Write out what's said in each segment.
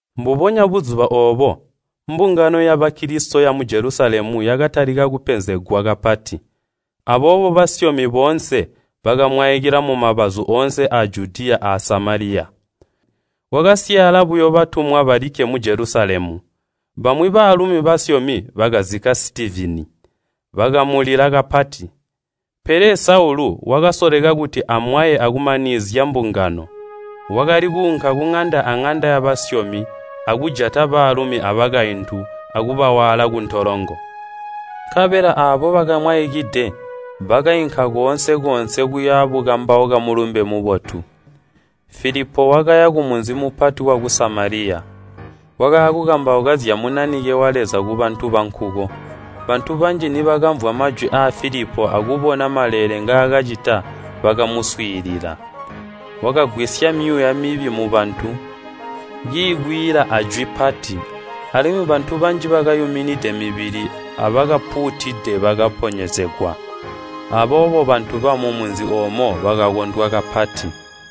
Mbubonya buzuba oobo, mbungano ya Bakilisito yamu Jelusalemu yakatalika kupenzegwa kapati. Aboobo basyomi boonse bakamwaikila mumabazu oonse aa Judiya a Samaliya. Kwakasyaala buyo batumwa balikke mu Jelusalemu. Bamwi baalumi basyomi bakazikka Sitivini, bakamulila kapati. Pele Saulu wakasoleka kuti amwaye akumanizya mbungano. Wakali kuunka kuŋanda aŋanda yabasyomi, akujata baalumi abakaintu akubawaala kuntolongo. Nkabela aabo bakamwaikide, bakainka koonse-koonse kuya bukambauka Mulumbe Mubotu. Filipo wakaya kumunzi mupati waku Samaliya, waakukambauka zya Munanike wa Leza kubantu bankuko. Bantu banji nibakamvwa majwi aa Filipo akubona maleele ngaakacita bakamuswiilila. Wakagwisya myuuya mibi mubantu, kiikwiila ajwi pati, alimwi bantu banji bakayuminide mibili abakapuutide bakaponyezegwa. Aboobo bantu bamumunzi oomo bakakondwa kapati.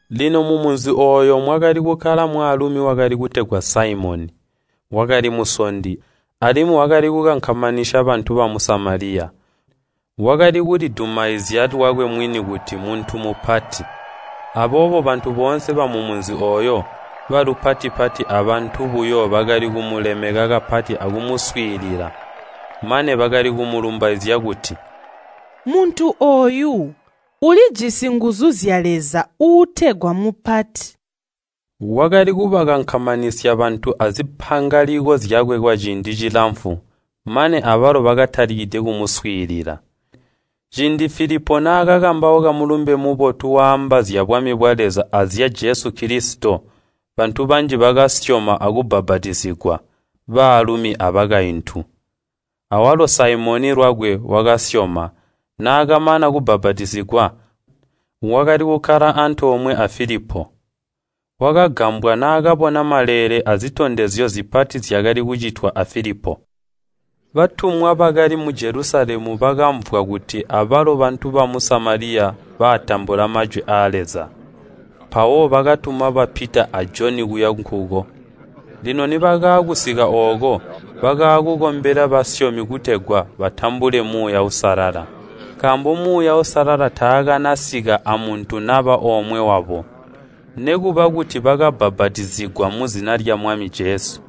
Lino mumunzi ooyo mwakali kukkala mwaalumi wali kutegwa Saimoni. Wakali musondi, alimwi wakali kukankamanisya bantu bamu Samaliya. Wakali kulidumaizya lwakwe mwini kuti mmuntu mupati. Aboobo bantu boonse bamumunzi ooyo, balupati-pati abantu buyo bakali kumulemeka kapati akumuswiilila. Mane bakali kumulumbaizya kuti, “Muntu ooyu ulijisi nguzu zya Leza uutegwa Mupati.” Wakali kubakankamanisya bantu azimpangaliko zyakwe kwaciindi cilamfu mane abalo bakatalikide kumuswiilila. Ciindi Filipo naakakambauka Mulumbe Mubotu waamba zyabwami bwa Leza azya Jesu Kilisito, bantu banji bakasyoma akubbapatizigwa, baalumi abakaintu. Awalo Saimoni lwakwe wakasyoma, naakamana kubbapatizigwa wakali kukkala antoomwe a Filipo. Wakagambwa naakabona maleele azitondezyo zipati zyakali kucitwa a Filipo. Batumwa bakali mu Jelusalemu bakamvwa kuti abalo bantu bamu Samaliya batambula majwi aa Leza, mpawo bakatuma ba Pita a Joni kuya nkuko. Lino nibakaakusika ooko, bakaakukombela basyomi kutegwa batambule Muuya Uusalala. Nkaambo Muuya Uusalala taakanasika amuntu naba omwe wabo, nikuba kuti bakabbapatizigwa muzina lya Mwami Jesu.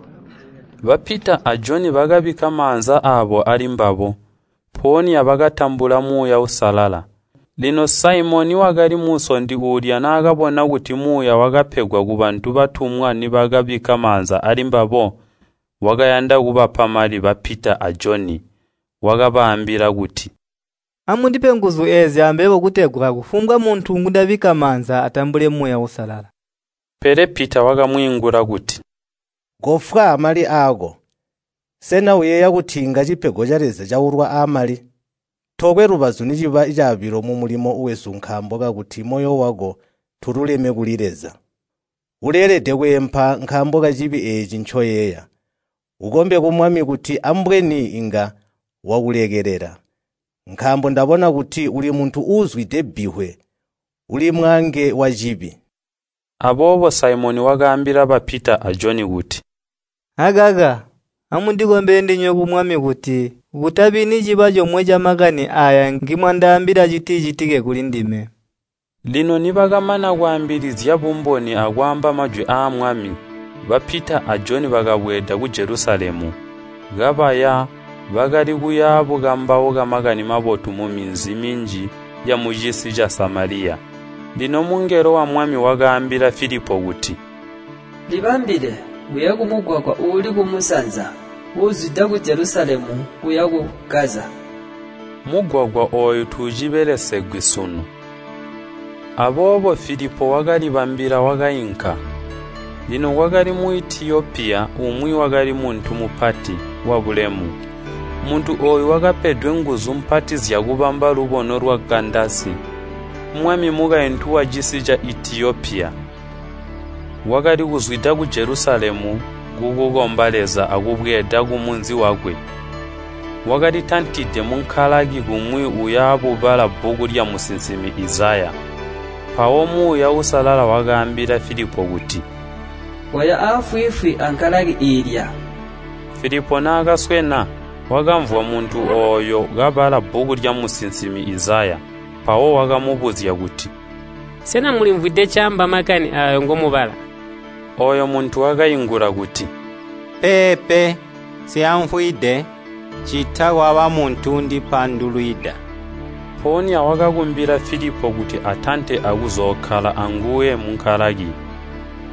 Ba Pita a Joni bakabikka maanza aabo alimbabo, mpoonya bakatambula Muuya Uusalala. Lino Saimoni wakali musondi uulya naakabona kuti Muuya wakapegwa kubantu batumwa nibakabikka maanza alimbabo. Wakayanda kubapa mali ba Pita a Joni. Wakabaambila kuti, “Amundipe nguzu eezi ambebo kutegwa kufumbwa muntu ngundabikka maanza atambule Muuya Uusalala.” Pele Pita wakamwiingula kuti, “Kofwa amali aako! Sena uyeeya kuti inga cipego ca Leza caulwa amali! Tokwe lubazu niciba caabilo mumulimo wesu nkaambo kakuti moyo wako tuululeme kuli Leza. Uleelede kweempa nkaambo kacibi eeci ncoyeeya. Ukombe ku Mwami kuti ambweni inga wakulekelela. Nkaambo ndabona kuti uli muntu uuzwide bbivwe, uli mwaange wacibi.” Aboobo Saimoni wakaambila ba Pita a Joni kuti, “Akaka, amundikombele ndinywe ku Mwami kuti kutabi niciba comwe camakani aaya ngimwandaambila citicitike kulindime.” Lino nibakamana kwaambilizya bumboni akwaamba majwi aa Mwami, ba Pita a Joni bakabweeda ku Jelusalemu. Kabaya, bakali kuya bukambauka Makani Mabotu muminzi minji yamucisi ca Samaliya. Lino mungelo wa Mwami wakaambila Filipo kuti, “Libambile, uye kumugwagwa uuli kumusanza, uuzwida ku Jelusalemu kuya ku Gaza.” Mugwagwa ooyu tuucibelesegwi sunu. Aboobo Filipo wakalibambila wakainka. Lino kwakali Muitiyopiya umwi wakali muntu mupati, wabulemu. Muntu ooyu wakapedwe nguzu mpati zyakubamba lubono lwa Kandasi, mwami mukaintu wacisi ca Itiyopiya. Wakali kuzwida ku Jelusalemu kukukomba Leza akubweeda kumunzi wakwe. Wakalitantide munkalaki kumwi uya bubala bbuku lyamusinsimi Izaya. Mpawo Muuya Uusalala wakaambila Filipo kuti, “Koya aafwiifwi ankalaki iilya.” Filipo naakaswena, wakamvwa muntu ooyo kabala bbuku lyamusinsimi Izaya, mpawo wakamubuzya kuti, “Sena mulimvwide ncaamba makani aayo ngomubala?” Ooyo muntu wakaingula kuti, “Peepe, nsyaamvwide, ccita kwaba muntu uundipandulwida.” Mpoonya wakakumbila Filipo kuti atante akuzookkala anguwe munkalaki.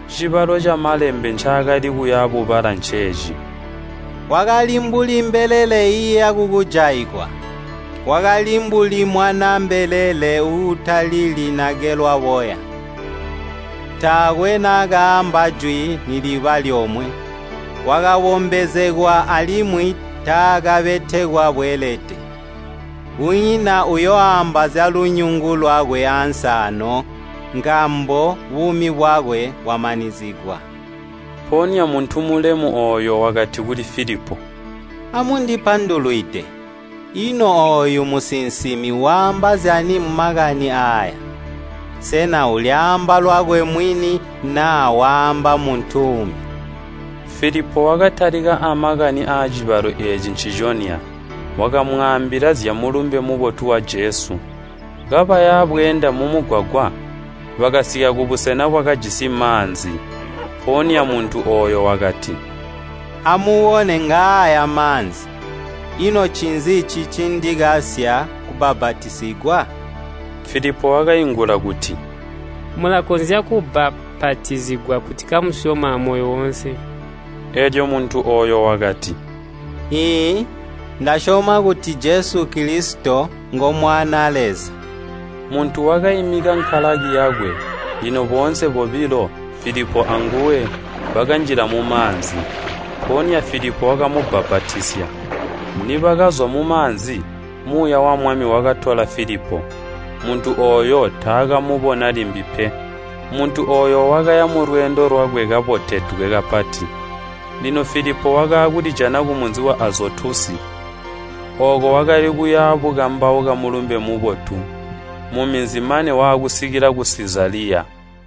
Cibalo ca Malembe ncaakali kuya bubala nceeci, “Wakali mbuli mbelele iiya kukujaigwa. Wakali mbuli mwanaa mbelele uutalili nagelwa boya. Taakwe naakaamba jwi niliba lyomwe. Wakabombezegwa alimwi taakabetekwa bweelede. Kunyina uyooamba zyalunyungu lwakwe ansi aano, nkaambo buumi bwakwe bwamanizigwa.” Mpoonya muntu mulemu ooyo wakati kuli Filipo, “Amundipandulwide, ino ooyu musinsimi waamba zyani mumakani aaya? Sena ulyaamba lwakwe mwini naa waamba muntu uumbi?” Filipo wakatalika amakani aacibalo eeci nciconya, wakamwaambila zya Mulumbe Mubotu wa Jesu. Kabaya bweenda mumugwagwa, bakasika kubusena bwakajisi maanzi. Mpoonya muntu ooyo wakati, “Amubone ngaaya maanzi. Ino ncinzi cicindikasya kubbapatizigwa?” [ Filipo wakaingula kuti, “Mulakonzya kubbapatizigwa kuti kamusyoma amoyo woonse.” Eelyo muntu ooyo wakati, “Iiyi, ndasyoma kuti Jesu Kilisito ngo Mwanaa Leza.” Muntu wakaimika nkalaki yakwe, lino boonse bobilo, Filipo anguwe, bakanjila mumaanzi, mpoonya Filipo wakamubbapatizya. Nibakazwa mumaanzi, Muuya wa Mwami wakatola Filipo. Muntu ooyo taakamubona limbi pe. Muntu ooyo wakaya mulweendo lwakwe kaboteledwe kapati. Lino Filipo wakaakulijana kumunzi wa Azotusi. Ooko wakali kuya bukambauka Mulumbe Mubotu muminzi mane waakusika ku Sizaliya.